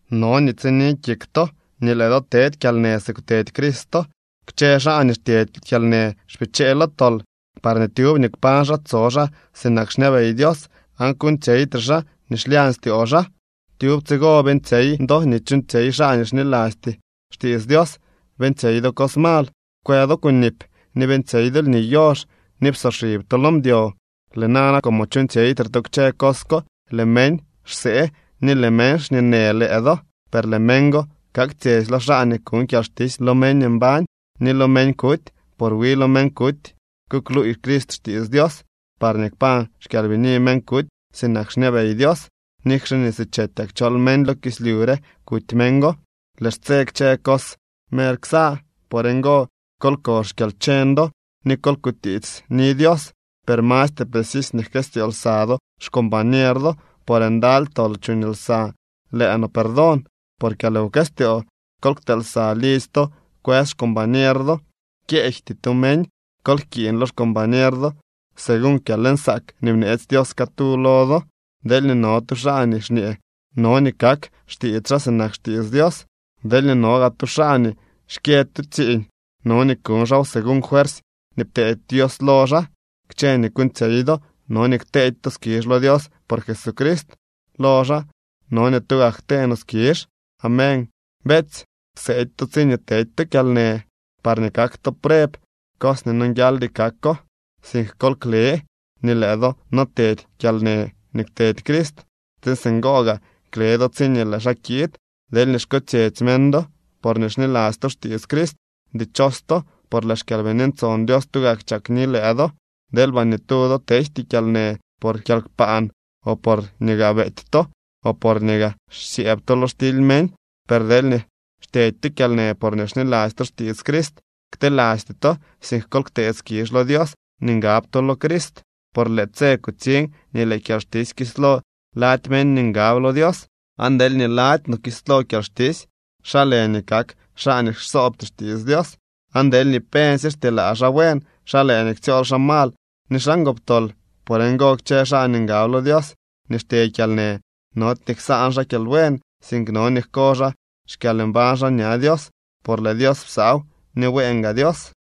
No nii tsini kik to nii lëë do tedy kyalnë si kwtedy Cristo. Kchë xaa nii xtyedy kyalnë xpichee lo tol, parñee tyub nii kpañ xaa tso xaa sinak xñabey Dios aan kuuñtsyeytre xaa nii xlyañ styoo xaa. Tyub tsigo beeñtsyey do nii chuuñtsyey xaa nii xnilasty xtiits Dios. Beeñtsyey do cos mal, kwë do kunip ni beeñtsyey do lni yox ni psoxib to lo mdyo. Lëë nana, como chuuñtsyeytre to kchë cos ko, lëë meñ xsee ni lëë meñ xñeenë lëë do. Per lëë meñ go kaktsyetsy lo xaa nii kuñ kyalxtisy lo meñ mbañ ni lo meñ kuty. Por wi lo meñ kuty kukluuy Crist xtiits Dios, parñee kpañ xkyalbini meñ kuty sinak xñabey Dios, nikxe nii si chetyak chol meñ lo kislyu re kuty meñ go. Lëë xtse kchë cos mer ksa. Por ngo, kol ko xkyalcheñ do ni kol kutiitsni Dios. Per mastre precisy nii jkëstyoo lsa do xcombañer do, por ndaly tol chuñ lsa lëë no perdon por kyalwkëstyoo. Kol ktee lsa lidzy to kwës xcombañer do, kyeejty to meñ. Kol jkiiñ lo xcombañer do según kyalnsaak nii bneetsy Dios catu lo do. Deelñee no tu xaa nii xñee, no nii kak xtiits xaa sinak xtiits Dios. Deelñee no gaa tu xaa nii xkyë tu tsiiñ no nii kuñ xaaw según fuersy nii pteedy Dios lo xaa. Kchë nii kuuñtsyey do no nii kteedy to skizh lo Dios por Jesucrist. Lo xaa, no nii tugak ktee no skizh. Amén. Beetsy, kseedy to tsiñee tedy to kyalnë, parñee kak to preb cos nii nonguialdy kako, sink kol kle nii lëë do no tedy kyalnë nii kwtedy Crist, tsiin singo gaa kle do tsiñee lëë xaa kiid. Deelñee xkotsyetsy meñ do porñee xniladzy to xtiits Crist, dichos to, por lëë xKyalbini Ntson Dios tugak chakni lëë do. Deelba ni tu do tejty kyalnë por kyalkpaan o porñee gaa beety to o porñee gaa xsyëëb to lo xtily meñ. Per deelñee xtyedy to kyalnë porñee xniladzy to xtiits Crist, ktelasty to, sink kol ktee skizh lo Dios nii ngab to lo Crist. Por lëë tse kutsiñ nii lëë kyalxtisy kislo lady meñ nii ngab lo Dios. Aan deelñee lady no kislo kyalxtisy, ¿xa lë nii kak xaa nii xsoobty xtiits Dios? Aan deelñee pensy xtyelaa xaa buen, ¿xa lë nii ktsyool xaa mal ni xaa ngoptol? Por ngo kchë xaa nii ngab lo Dios nii xtye kyalnë, nody nii ksaan xaa kyalbuen, sink no nii jko xaa xkyalmbañ xaa ña Dios, por lëë Dios psaaw, ni bueen gaa Dios.